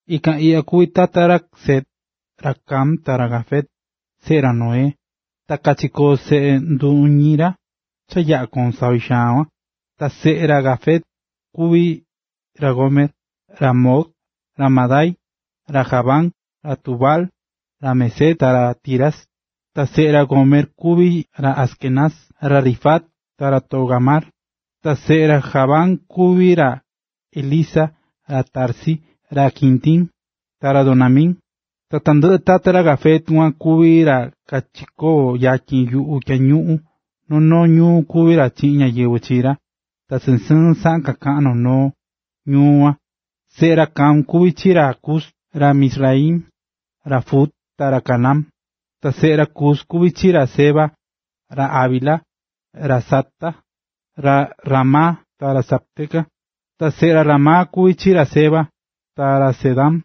Ikan iꞌya kuví tata ra Sem, ra Cam, ta ra Jafet, seꞌe ra Noé. Ta kachikoo̱ seꞌe nduñi ra cha yaꞌa̱ koo̱n savi xaan kuan. Ta seꞌe ra Jafet kuví ra Gomer, ra Magog, ra Madai, ra Javán, ra Tubal, ra Mesec ta ra Tiras. Ta seꞌe ra Gomer kuví ra Askenaz, ra Rifat ta ra Togarma. Ta seꞌe ra Javán kuví ra Elisa, ra Tarsis, ra Quitim, ta ra Dodanim. Ta tandɨꞌɨ tata ra Jafet kuan kuví ra kachikoo̱ yatyin yuꞌu tyañuꞌun, noo noo ñuu kuví ra chiꞌin ñáyɨvɨ chi ra, ta sɨɨn sɨɨn saꞌan kakaꞌán noo noo ñuu kuan. Seꞌe ra Cam kuví ra chi ra Cus, ra Mizraim, ra Fut, ta ra Canaán. Ta seꞌe ra Cus kuví chi ra Seba, ra Havila, ra Sabta, ra Raama ta ra Sabteca. Ta seꞌe ra Raama kuví chi ra Seba ta ra Dedán.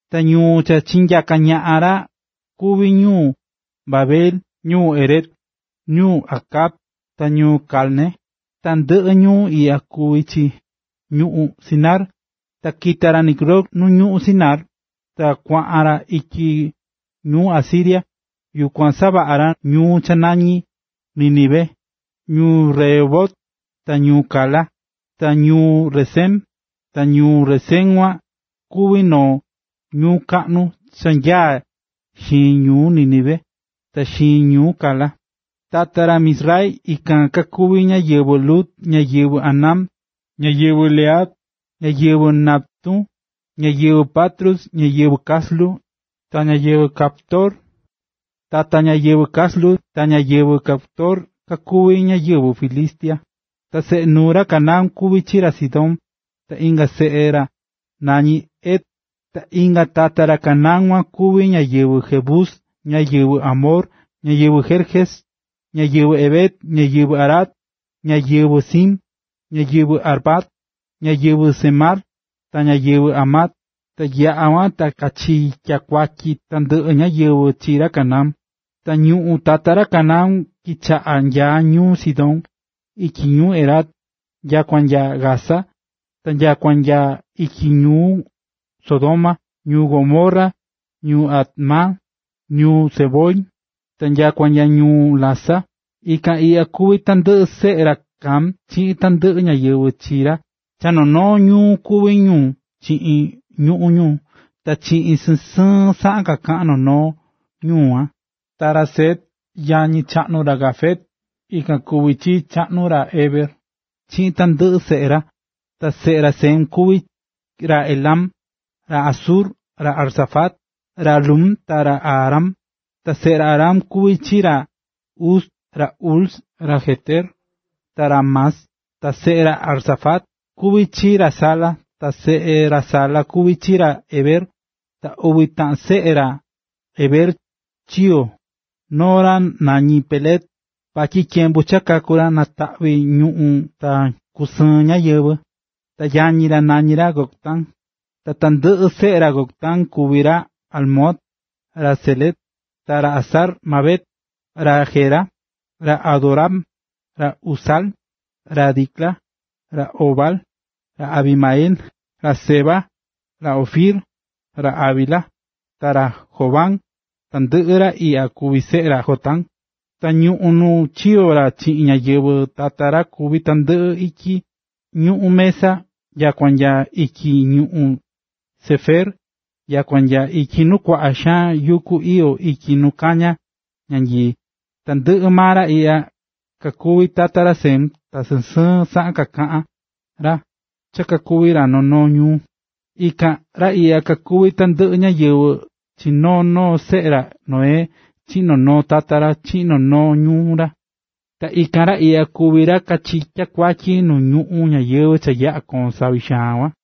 Ta ñuu cha chinyaka̱ ñaꞌan ra kuví ñuu Babel, ñuu Erec, ñuu Acad, ta ñuu Calne. Tandɨꞌɨ ñuu iꞌya kuvi chi ñuꞌún Sinar. Ta kita̱ ra Nimrod nu ñuꞌún Sinar, ta kuaꞌan ra ityi ñuꞌún Asiria, yukuan savaꞌa̱ ra ñuu cha nañí Nínive, ñuu Rehobot, ta ñuu Cala, ta ñuu Resén. Ta ñuu Resén kuan kuvi̱ noo ñuu kaꞌnu, cha nyaá xiin ñuu Nínive, ta xiin ñuu Cala. Tata ra Mizraim ikan kakuví ñáyɨvɨ Lud, ñáyɨvɨ Anam, ñáyɨvɨ Lehab, ñáyɨvɨ Naftu, ñáyɨvɨ Patrus, ñáyɨvɨ Caslu ta ñáyɨvɨ Caftor. Ta tata ñáyɨvɨ Caslu ta ñáyɨvɨ Caftor kakuví ñáyɨvɨ Filistia. Ta seꞌe nuu ra Canaán kuví ra Sidón ta inga seꞌe ra nañí ra Het. Ta inga tata ra Canaán kuan kuví ñáyɨvɨ Jebus, ñáyɨvɨ Amor, ñáyɨvɨ Gerges, ñáyɨvɨ Hev, ñáyɨvɨ Arac, ñáyɨvɨ Sin, ñáyɨvɨ Arvad, ñáyɨvɨ Zemar, ta ñáyɨvɨ Hamat. Ta yaꞌa̱ kuan ta kachitya̱ kuatyi tandɨꞌɨ ñáyɨvɨ chi ra Canaán. Ta ñuꞌún tata ra Canaán chitaꞌa̱n nya ñuu Sidón, ityi ñuu Gerar, nyakua nya Gaza, ta nyakua nya ityi ñuu Sodoma, ñuu Gomorra, ñuu Adma, ñuu Zeboim, ta nyakua nya ñuu Lasa. Ikan iꞌya kuví tandɨꞌɨ seꞌe ra Cam, chiꞌin tandɨꞌɨ ñáyɨvɨ chi ra, cha noo noo ñuu kuví ñu chiꞌin ñuꞌún ñu, ta cha sɨɨn sɨɨn saꞌan kaꞌán noo noo ñuu kuan. Ta ra Sem, yañi chaꞌnu ra Jafet, ikan kuví chii chaꞌnu ra Hebera chiꞌin tandɨꞌɨ seꞌe ra. Ta seꞌe ra Sem kuví ra Elam, ra Asur, ra Arfaxad, ra Lud ta ra Aram. Ta seꞌe ra Aram kuví ra Uz, ra Hul, ra Geter, ta ra Mas. Ta seꞌe ra Arfaxad kuví chi ra Sala, ta seꞌe ra Sala kuví chi ra Heber. Ta uvi taꞌan seꞌe ra Heber chiyo̱. Noo ra nañí Peleg, vatyi tyembu cha kaku̱ ra nataꞌvi̱ ñuꞌún ta kusɨɨ̱n ñáyɨvɨ. Ta yañi ra nañi̱ ra Joctán. Ta tandɨꞌɨ seꞌe ra Joctán kuví ra Almodad, ra Selef, ra Hazar-mavet, ra Jera, ra Adoram, ra Uzal, ra Dicla, ra Obal, ra Abimael, ra Seba, ra Ofir, ra Havila ta ra Jobab. Tandɨꞌɨ ra iꞌya kuví seꞌe ra Joctán. Ta ñuꞌún nu chikoo̱ ra chiꞌin ñáyɨvɨ tata ra kuví tandɨꞌɨ ityi ñuꞌún Mesa nyakua nya ityi ñuꞌún Sefer, nyakua nya ityi nu kuaꞌa xaan yuku iyó ityi nu kañá ñanyii. Tandɨꞌɨ maa ra iꞌya kakuví tata ra Sem, ta sɨɨn sɨɨn saꞌan kakaꞌa̱n ra cha kakuví ra noo noo ñuu. Ikan ra iꞌya kakuví tandɨꞌɨ ñáyɨvɨ chi noo noo seꞌe ra Noé, chiꞌin noo noo tata ra, chiꞌin noo noo ñuu ra. Ta ikan ra iꞌya kuví ra kachitya̱ nu ñuꞌún ñáyɨvɨ cha yaꞌa̱ koo̱n savi xaan kuan.